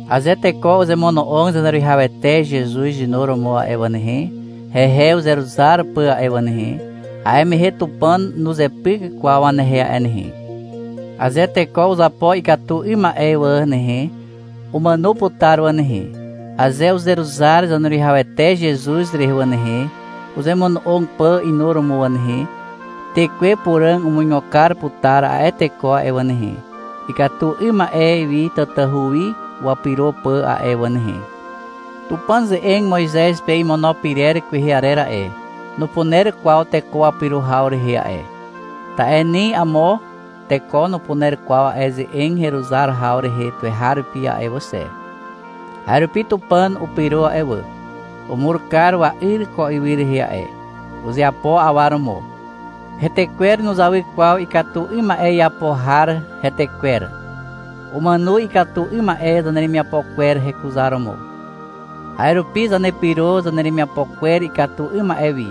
Aze teko uzemono'og Zaneruwihawete Zezuz inuromo a'e wà nehe, hehe uzeruzar pà a'e wà nehe, a'e mehe Tupàn nuzepyk kwaw wanehe a'e nehe. Aze teko uzapo ikatu 'ym ma'e wà nehe, umàno putar wà nehe. Aze uzeruzar Zaneruwihawete Zezuz rehe wà nehe, uzemono'og pà inuromo wà nehe, Tekwe Puràg umuigo kar putar a'e teko a'e wà nehe, ikatu 'ym ma'e wi tatahu wi wapyro pà a'e wà nehe. Tupàn ze'eg Moizez pe imono pyrer kwehe arer a'e, nupuner kwaw teko wapyro haw rehe a'e, ta'e ni amo teko nupuner kwaw a'e ze'eg heruzar haw rehe tuweharupi a'e wà xe. A'e rupi Tupàn upyro a'e wà. Umur kar wa'yr ko ywy rehe a'e. Uzeapo awa romo. Hetekwer nuzawy kwaw ikatu 'ym ma'e iapo har retekwer. Umàno ikatu 'ym ma'e zaneremiapo kwer hekuzaromo. A'e rupi zanepyro zaneremiapo kwer ikatu 'ym ma'e wi.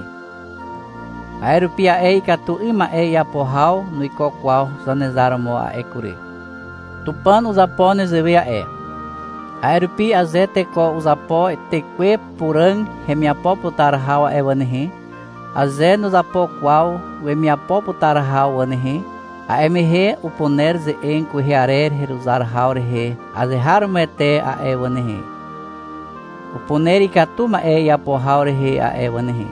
A'e rupi a'e ikatu 'ym ma'e iapo haw nuiko kwaw Zanezar romo a'e kury. Tupàn uzapo nezewe a'e. A'e rupi aze teko uzapo Tekwe Puràg hemiapo putar haw a'e wà nehe, aze nuzapo kwaw wemiapo putar haw wà nehe, a'e mehe upuner ze'eg kwehe arer heruzar haw rehe azeharomoete a'e wà nehe. Upuner ikatu ma'e iapo haw rehe a'e wà nehe.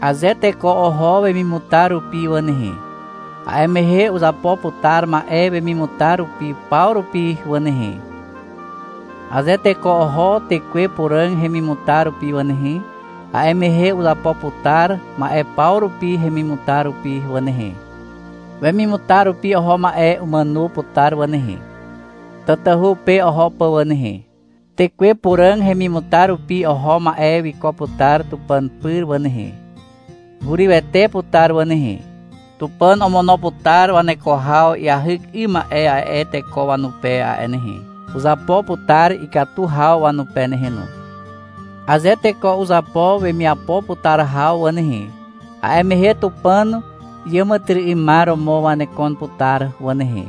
Aze teko oho wemimutar rupi wà nehe, a'e mehe uzapo putar ma'e wemimutar rupi paw rupi wà nehe. Aze teko oho Tekwe Puràg hemimutar rupi wà nehe, a'e mehe uzapo putar ma'e paw rupi hemimutar rupi wà nehe. Wemimutar rupi oho ma'e umàno putar wà nehe, tatahu pe oho pà wà nehe. Tekwe Puràg hemimutar rupi oho ma'e wiko putar Tupàn pyr wà nehe. Hurywete putar wà nehe. Tupàn omono putar waneko haw iahyk 'ym ma'e a'e teko wanupe a'e nehe. Uzapo putar ikatu haw wanupe nehe no. Aze teko uzapo wemiapo putar haw wà nehe, a'e mehe Tupàn iàmàtyry'ymar romo wanekon putar wà nehe,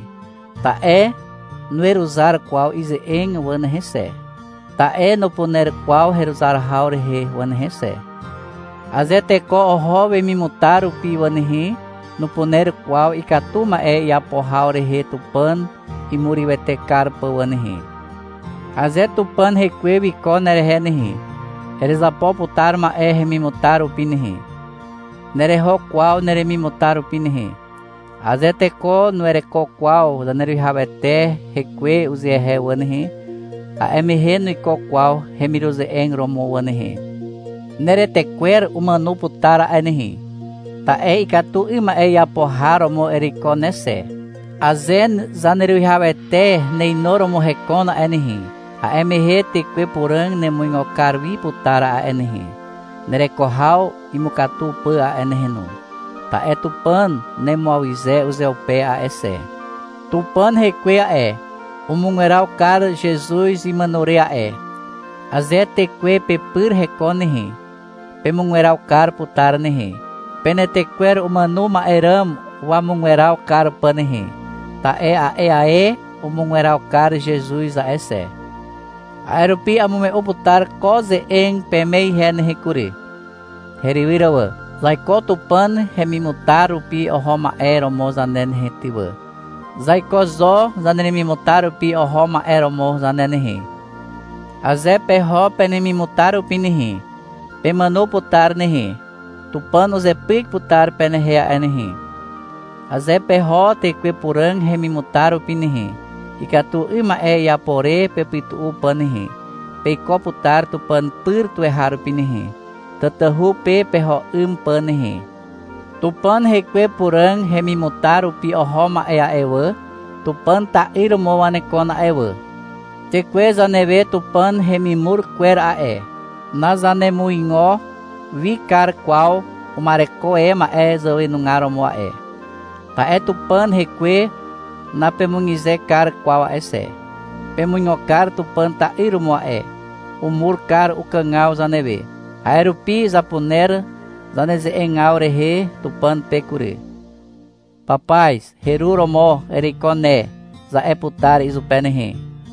ta'e nuweruzar kwaw ize'eg wà nehe xe, ta'e nupuner kwaw heruzar haw rehe wà nehe xe. Aze teko oho wemimutar rupi wà nehe, nupuner kwaw ikatu ma'e iapo haw rehe Tupàn imurywete kar pà wà nehe. Aze Tupàn Hekwe wiko nerehe nehe, erezapo putar ma'e hemimutar rupi nehe. Nereho kwaw neremimutar rupi nehe. Aze teko nuwereko kwaw Zaneruwihawete hekwe uzehe wà nehe, a'e mehe nuiko kwaw hemiruze'eg romo wà nehe. Neretekwer umàno putar a'e nehe, ta'e ikatu 'ym ma'e iapo har romo ereiko ne xe. Aze Zaneruwihawete neinuromo hekon a'e nehe, a'e mehe Tekwe Puràg nemuigo kar wi putar a'e nehe, nereko haw imukatu pà a'e nehe no. Ta'e Tupàn nemuawyze uzeupe a'e xe. Tupàn Hekwe a'e, umugweraw kar Zezuz imàno re a'e. Aze Tekwe pepyr hekon nehe, pemugweraw kar putar nehe, penetekwer umàno ma'e ràm wamugweraw kar pà nehe, ta'e a'e ae umugweraw kar Zezuz a'e xe. A'e rupi amume'u putar ko ze'eg peme ihe nehe kury, herywyr wà. Zaiko Tupàn hemimutar rupi oho ma'e romo zane nehe ty wà. Zaiko zo zaneremimutar rupi oho ma'e romo zane nehe. Aze peho penemimutar rupi nehe, pemàno putar nehe. Tupàn uzepyk putar penehe a'e nehe. Aze peho Tekwe Puràg hemimutar rupi nehe, ikatu 'ym ma'e iapo re pepytu'u pà nehe, peiko putar Tupàn pyr tuweharupi nehe, tatahu pe peho 'ym pà nehe. Tupàn Hekwe Puràg hemimutar rupi oho ma'e a'e wà, Tupàn ta'yr romo wanekon a'e wà. Tekwe zanewe Tupàn hemimur kwer a'e, nazanemuigo wi kar kwaw uma'ereko e ma'e zàwenugar romo a'e. Ta'e Tupàn Hekwe napemukyze kar kwaw a'e xe. Pemuigo kar Tupàn ta'yr romo a'e. Umur kar ukàgaw zanewe. A'e rupi zapuner zaneze'egaw rehe Tupàn pe kury. — Papaz, heru romo ereiko ne, za'e putar izupe nehe.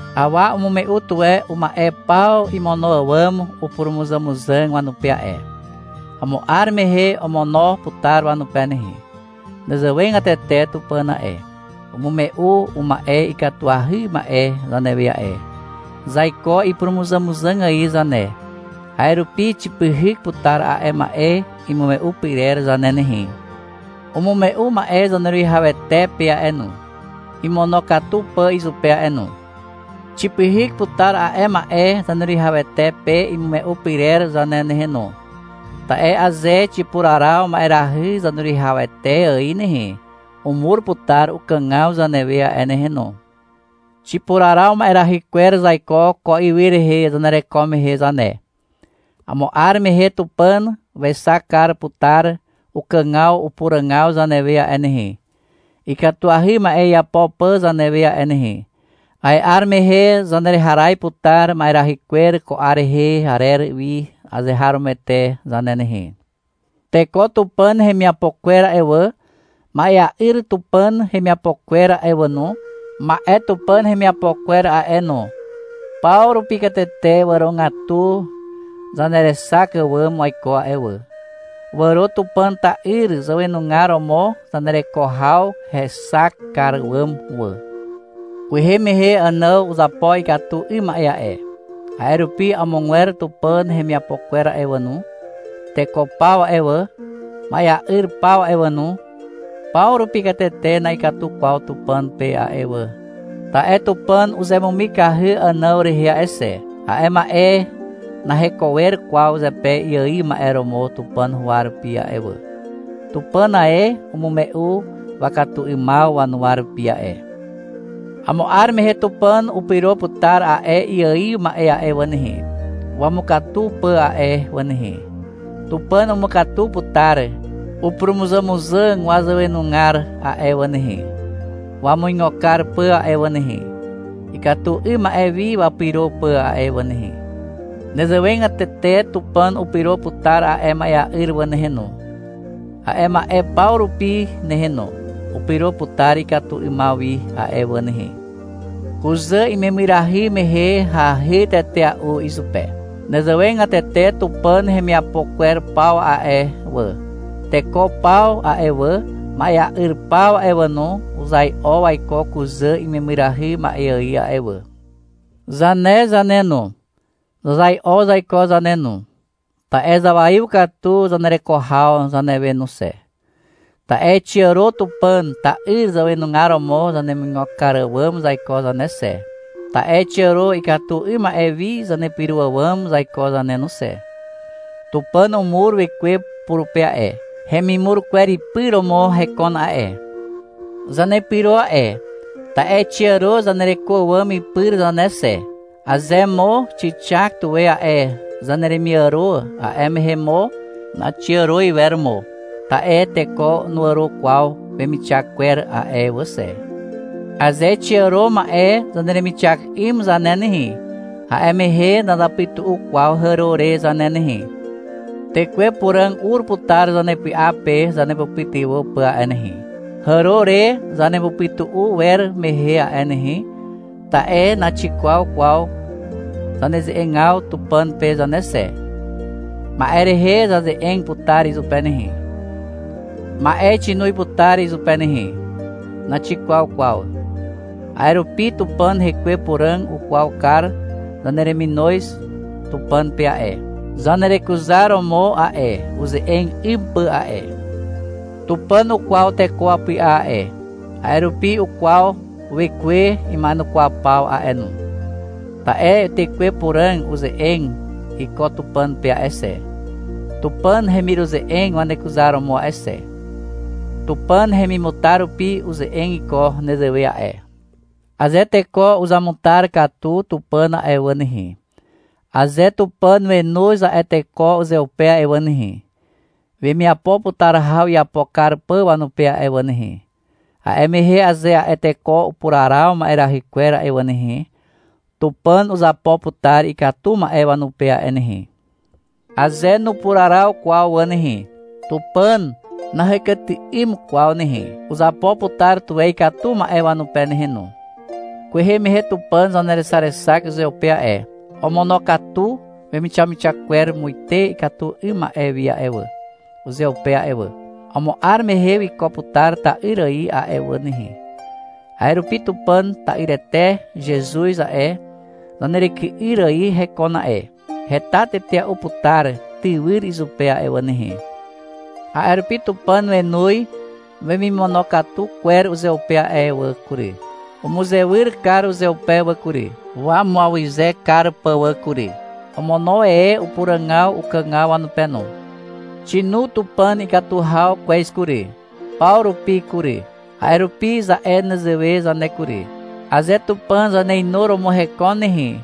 Awa umume'u tuwe uma'e paw imono àwàm upurumuzàmuzàg wanupe a'e. Amo 'ar mehe omono putar wanupe nehe. Nezewegatete Tupàn a'e. Umume'u uma'e ikatuahy ma'e zanewe a'e. Zaiko ipurumuzàmuzàg ài zane, a'e rupi xipyhyk putar a'e ma'e imume'u pyrer zane nehe. Umume'u ma'e Zaneruwihawete pe a'e no, imonokatu pà izupe a'e no. Xipyhyk putar a'e ma'e Zaneruwihawete pe imume'u pyrer zane nehe no. Ta'e aze xipuraraw ma'erahy Zaneruwihawete ài nehe, umur putar ukàgaw zanewe a'e nehe no. Xipuraraw ma'erahy kwer zaiko ko ywy rehe zanereko mehe zane. Amo 'ar mehe Tupàn wexak kar putar ukàgaw upuràgaw zanewe a'e nehe, ikatuahy ma'e iapo pà zanewe a'e nehe. A'e 'ar mehe zanereharaz putar ma'erahy kwer ko 'ar rehe arer wi azeharomoete zane nehe. Teko Tupàn hemiapo kwer a'e wà, ma'ea'yr Tupàn hemiapo kwer a'e wà no, ma'e Tupàn hemiapo kwer a'e no, paw rupi katete wàrogatu zanerexak àwàm waiko a'e wà. Wàro Tupàn ta'yr zàwenugar romo zanereko haw hexak kar àwàm wà. Kwehe mehe Ànàw uzapo ikatu 'ym ma'e a'e. A'e rupi amogwer Tupàn hemiapo kwer a'e wà no. Teko paw a'e wà, ma'ea'yr paw a'e wà no, paw rupi katete na'ikatu kwaw Tupàn pe a'e wà, ta'e Tupàn uzemumikahy Ànàw rehe a'e xe. A'e ma'e naheko wer kwaw zepe iaiw ma'e romo Tupàn huwa rupi a'e wà. Tupàn ae umume'u wakatu 'ymaw wanuwa rupi a'e. Amo 'ar mehe Tupàn upyro putar a'e iaiw ma'e a'e wà nehe, wamukatu pà a'e wà nehe. Tupàn umukatu putar upurumuzàmuzàg zàwenugar a'e wà nehe, wamuigo kar pà a'e wà nehe, ikatu 'ym ma'e wi wapyro pà a'e wà nehe. Nezewegatete Tupàn upyro putar a'e ma'ea'yr wà nehe no, a'e ma'e paw rupi nehe no. Upyro putar ikatu 'ymaw wi a'e wà nehe. Kuzà imemyrahy mehe hahy tetea'u izupe. Nezewegatete Tupàn hemiapo kwer paw a'e wà. Teko paw a'e wà, ma'ea'yr paw a'e wà no, uzai'o waiko kuzà imemyrahy ma'e ài a'e wà. Zane zane no, zazai'o zaiko zane no. Ta'e zawaiw katu zanereko haw zanewe no xe. Ta'e xiàro Tupàn ta'yr zàwenugar romo zanemuigo kar àwàm zaiko zane xe. Ta'e xiàro ikatu 'ym ma'e wi zanepyro àwàm zaiko zane no xe. Tupàn umur Wekwe purupe a'e. Hemimur kwer ipy romo hekon a'e. Zanepyro a'e, ta'e xiàro zanereko àwàm ipyr zane xe. Aze mo xixak tuwe a'e zaneremiàro, a'e mehe mo naxiàro iwer mo, ta'e teko nuàro kwaw wemixak kwer a'e wà xe. Aze xiaro ma'e zaneremixak 'ym zane nehe, a'e mehe nazapytu'u kwaw hàro re zane nehe. Tekwe Puràg ur putar zanepy'a pe zanepytywà pà a'e nehe, hàro re zanepytu'u wer mehe a'e nehe. Ta'e naxikwaw kwaw zaneze'egaw Tupàn pe zane xe. Ma'e rehe zaze'eg putar izupe nehe. Ma'e xinoz putar izupe nehe. Naxikwaw kwaw. A'e rupi Tupàn Hekwe Puràg ukwaw kar zanereminoz Tupàn pe a'e, zanerekuzaromo a'e, uze'eg 'ym pà a'e. Tupàn ukwaw teko wapy'a a'e, a'e rupi ukwaw Wekwe ima'enukwaw paw a'e no. Ta'e Tekwe Puràg uze'eg iko Tupàn pe a'e xe, Tupàn hemiruze'eg wanekuzaromo a'e xe. Tupàn hemimutar rupi uze'eg iko nezewe a'e. Aze teko uzamutar katu Tupàn a'e wà nehe, aze Tupàn wenoz a'e teko uzeupe a'e wà nehe, wemiapo putar haw iapo kar pà wanupe a'e wà nehe, a'e mehe aze a'e teko upuraraw ma'erahy kwer a'e wà nehe, Tupàn uzapo putar ikatu ma'e wanupe a'e nehe. Aze nupuraraw kwaw wà nehe, Tupàn nahekyty'ym kwaw nehe. Uzapo putar tuwe ikatu ma'e wanupe nehe no. Kwehe mehe Tupàn zanerexarexak uzeupe a'e. Omonokatu wemixamixak kwer muite ikatu 'ym ma'e wi a'e wà, uzeupe a'e wà. Amo 'ar mehe wiko putar ta'yr ài a'e wà nehe. A'e rupi Tupàn ta'yrete Zezuz a'e, zaneryky'yr ài hekon a'e. Heta tetea'u putar tywyr izupe a'e wà nehe. A'e rupi Tupàn wenoz wemimonokatu kwer uzeupe a'e wà kury. Umuzewyr kar uzeupe wà kury, wamuawyze kar pà wà kury. Omono e upuràgaw ukàgaw wanupe no. Xinu Tupàn ikatu haw kwez kury, paw rupi kury. A'e rupi za'e nezewe zane kury. Aze Tupàn zaneinuromo hekon nehe,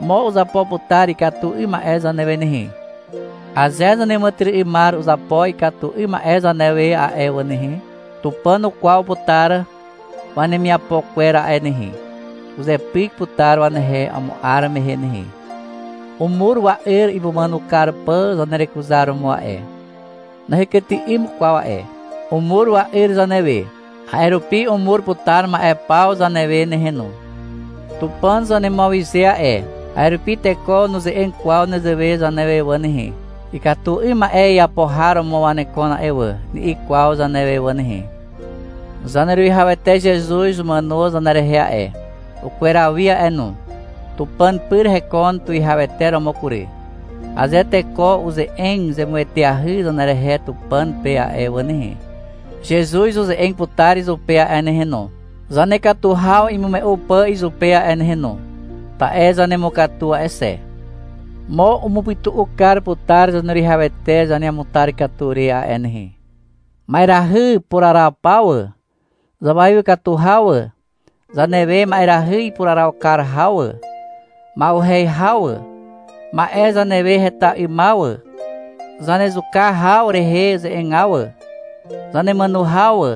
mo uzapo putar ikatu 'ym ma'e zanewe nehe. Aze zaneàmàtyry'ymar uzapo ikatu 'ym ma'e zanewe a'e wà nehe, Tupàn ukwaw putar wanemiapo kwer a'e nehe. Uzepyk putar wanehe amo 'ar mehe nehe. Umur wa'yr imumàno kar pà zanerekuzaromo a'e. Nahekyty'ym kwaw a'e. Umur wa'yr zanewe, a'e rupi umur putar ma'e paw zanewe nehe no. Tupàn zanemuawyze a'e. A'e rupi teko nuze'eg kwaw nezewe zanewe wà nehe. — Ikatu 'ym ma'e iapo har romo wanekon a'e wà, ni'i kwaw zanewe wà nehe. Zaneruwihawete Zezuz umàno zanerehe a'e, ukweraw wi a'e no, Tupàn pyr hekon tuwihawete romo kury. Aze teko uze'eg zemueteahy zanerehe Tupàn pe a'e wà nehe, Zezuz uze'eg putar izupe a'e nehe no, zanekatu haw imume'u pà izupe a'e nehe no, (ta'e zanemukatu a'e xe). Mo umupytu'u kar putar Zaneruwihawete zaneamutar katu re a'e nehe. Ma'erahy puraraw paw wà, zawaiw katu haw wà, zanewe ma'erahy ipuraraw kar haw wà, ma'uhez haw wà, ma'e zanewe heta 'ymaw wà, zanezuka haw rehe ze'egaw wà, zanemàno haw wà.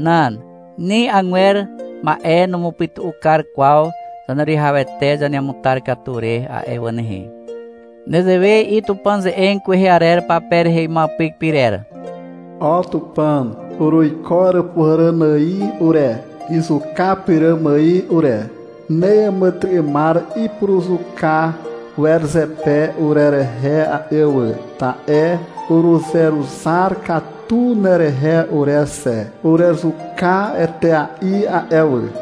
Nan, ni agwer ma'e numupytu'u kar kwaw Zaneruwihawete zaneamutar katu re a'e wà nehe. Nezewe i'i Tupàn ze'eg kwehe arer pape rehe imuapyk pyrer. — O Tupàn, uruiko Àràpuhàràn ài ure, izuka pyràm ài ure. Neàmàtyry'ymar ipuruzuka wer zepe urerehe a'e wà, ta'e uruzeruzar katu nerehe ure xe. Urezuka etea'i a'e wà.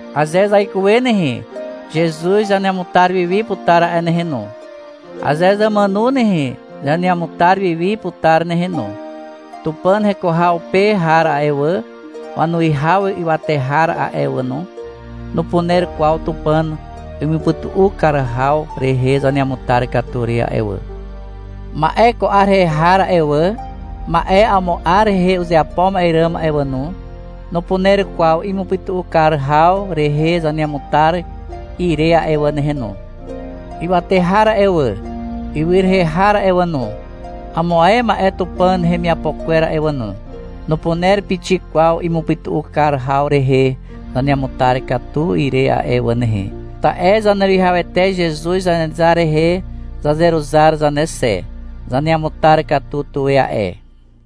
Aze zaikuwe nehe, Zezuz zaneamutar wi wi putar a'e nehe no. Aze zàmàno nehe, zaneamutar wi wi putar nehe no. Tupàn heko haw pe har a'e wà, wanuwihaw ywate har a'e wà no, nupuner kwaw Tupàn imupytu'u kar haw rehe zaneamutar katu re a'e wà. Ma'e ko 'ar rehe har a'e wà, ma'e amo 'ar rehe uzeapo ma'e ràm a'e wà no, nupuner kwaw imupytu'u kar haw rehe zaneamutar ire a'e wà nehe no. Ywate har a'e wà, ywy rehe har a'e wà no, amo ae ma'e Tupàn hemiapo kwer a'e wà no, nupuner pixik kwaw imupytu'u kar haw rehe zaneamutar ire a'e wà nehe, ta'e Zaneruwihawete Zezuz Zanezar rehe zazeruzar zane xe. Zaneamutar katu tuwe a'e.